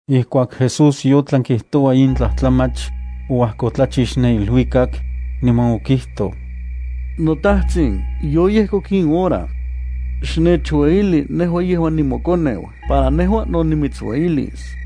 Ijkuak Jesús yotlan kijtoua in tlajtlamach, oajkotlachix ne iluikak, niman okijtoj: —NoTajtsin, yoyejkok in hora. Xnechueyili nejua yejuan nimoKoneu para nejua no nimitsueyilis.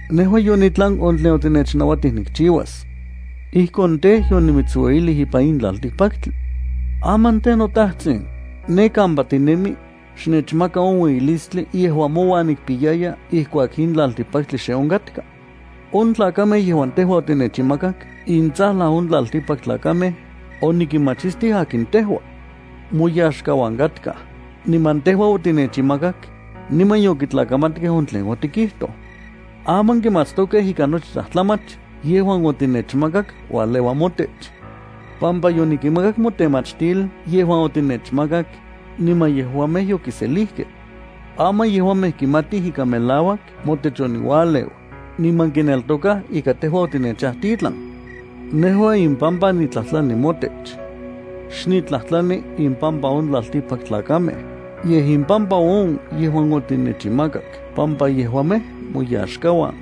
Nejua yonitlan on tlen otinechnauatij nikchiuas. Ijkon tej, yonimitsueyilij ipan in tlaltikpaktli. Aman tej, noTajtsin, ne kampa tinemi, xnechmaka on ueyilistli yejuan mouan nikpiyaya ijkuak in tlaltikpaktli xe onkatka. On tlakamej yejuan tejua otinechinmakak intsajlan on tlaltikpaktlakamej onikinmachistij akin tejua. Moyaxkauan katkaj, niman tejua otinechinmakak, niman yokitlakamatkej on tlen otikijtoj. Aman kimatstokej ika nochi tlajtlamach yejuan otinechmakak ualeua motech, pampa yonikinmakak motemachtil yejuan otinechmakak, niman yejuamej yokiselijkej. Aman yejuamej kimatij ika melauak motech oniualeu, niman kineltokaj ika tejua otinechajtitlan. ’Nejua impampa nitlajtlani motech. Xniktlajtlani impampa on tlaltikpaktlakamej, yej impampa on yejuan otinechinmakak pampa yejuamej moyaxkauan.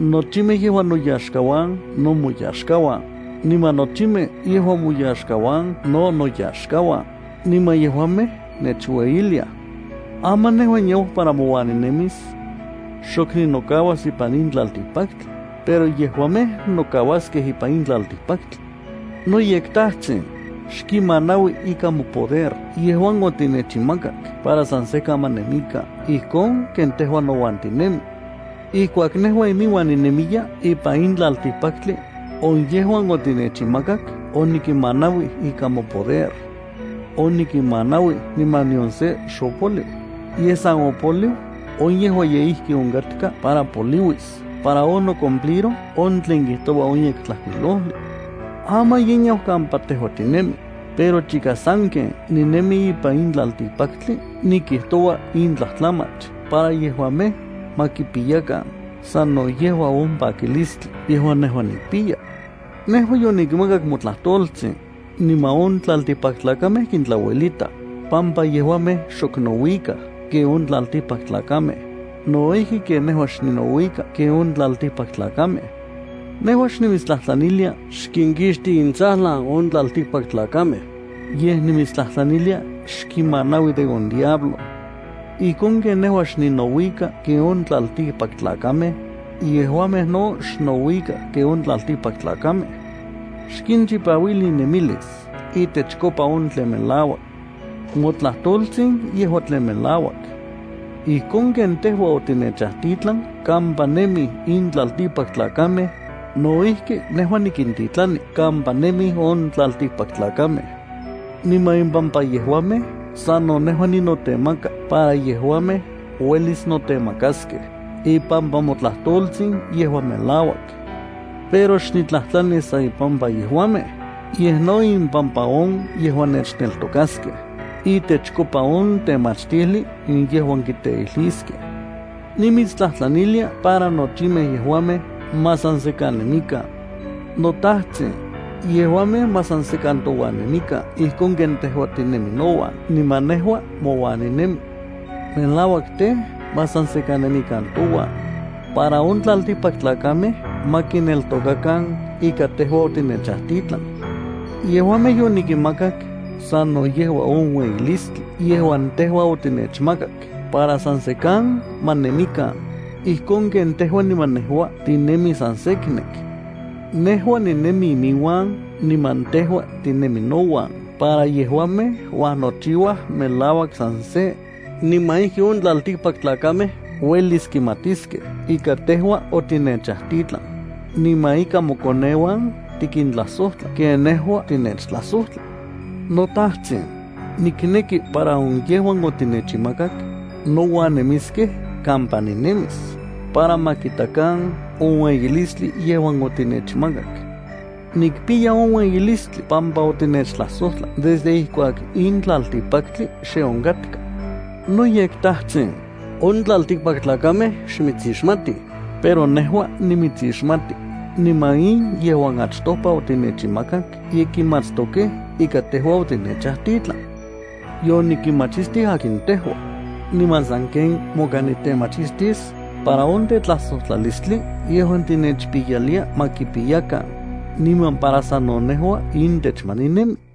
Nochimej yejuan noyaxkauan no moyaxkauan, niman nochimej yejuan moyaxkauan no noyaxkauan, niman yejuamej nechueyiliaj. ’Aman nejua niau para mouan nonemis. Xok ninokauas ipan in tlaltikpaktli, pero yejuamej nokauaskej ipan in tlaltikpaktli. NoyekTajtsin, xkinmanaui ikan mopoder yejuan otinechinmakak para san sekan ma nemikan ijkon ken tejua nouan tinemi. Ijkuak nejua iminuan ninemiya ipan in tlaltikpaktli, on yejuan otinechinmakak onikinmanauij ikan mopoder. Onikinmanauij niman nion se xopoliu, yej san opoliu on yejuan ye ijki onkatka para poliuis para onocumpliroj on tlen kijtoua on Yektlajkuilojli. ’Aman ye niau kampa tejua tinemi, pero chika sanken ninemi ipan in tlaltikpaktli nikijtoua in tlatlamach para yejuamej ma kipiyakan sano yejua on pakilistli yejuan nejua nikpiya. Nejua yonikinmakak motlajtoltsin, niman on tlaltikpaktlakamej kintlauelitaj, pampa yejuamej xok nouikaj ken on tlaltikpaktlakamej no ijki ken nejua xninouika ken on tlaltikpaktlakamej. Nejua xnimitstlajtlanilia xkinkixti intsajlan on tlaltikpaktlakamej, yej nimitstlajtlanilia xkinmanaui de on diablo. Ijkon ken nejua xninouika ken on tlaltikpaktlakamej, yejuamej no xnouikaj ken on tlaltikpaktlakamej. Xkinchipauili innemilis itechkopa on tlen melauak. Motlajtoltsin yejua tlen melauak. Ijkon ken tejua otinechajtitlan kampa nemij in tlaltikpaktlakamej, no ijki nejua nikintitlani kampa nemij on tlaltikpaktlakamej. Niman impampa yejuamej sano nejua ninotemaka para yejuamej uelis notemakaskej ipampa motlajtoltsin yejuan melauak. ’Pero xnitlajtlani san impampa yejuamej, yej no impampa on yejuan nechneltokaskej itechkopa on temachtijli yejuan kiteijliskej. Nimitstlajtlanilia para nochimej yejuamej ma san sekan nemikan. NoTajtsin, yejuamej ma san sekan touan nemikan ijkon ken tejua tinemi nouan niman nejua mouan ninemi. Melauak tej, ma san sekan nemikan touan para on tlaltikpaktlakamej ma kineltokakan ika tejua otinechajtitlan. Yejuamej yonikinmakak sano yejua on ueyilistli yejuan tejua otinechmakak para san sekan ma nemikan, ijkon ken tejua niman nejua tinemij san seknek. Nejua ninemi iminuan niman tejua tinemi nouan para yejuamej uajnochiuaj melauak san se niman ijki on tlaltikpaktlakamej uelis kimatiskej ika tejua otinechajtitlan, niman ika mokoneuan tikintlajsojtla ken nejua tinechtlajsojtla. ’NoTajtsin, nikneki para on yejuan otinechinmakak nouan nemiskej kampa ninemis para ma kitakan on ueyilistli yejuan otinechmakak. Nikpiya on ueyilistli pampa otinechtlajsojtlak desde ijkuak in tlaltikpaktli xe onkatka. NoyekTajtsin, on tlaltikpaktlakamej xmitsixmatij, pero nejua nimitsixmati, niman in yejuan achtopa otinechinmakak ye kimatstokej ika tejua otinechajtitlan. Yonikinmachistij akin tejua, niman sanken moka nitemachistis para on tetlajsojtlalistli yejuan tinechpiyalia ma kipiyakan, niman para sano nejua intech ma ninemi.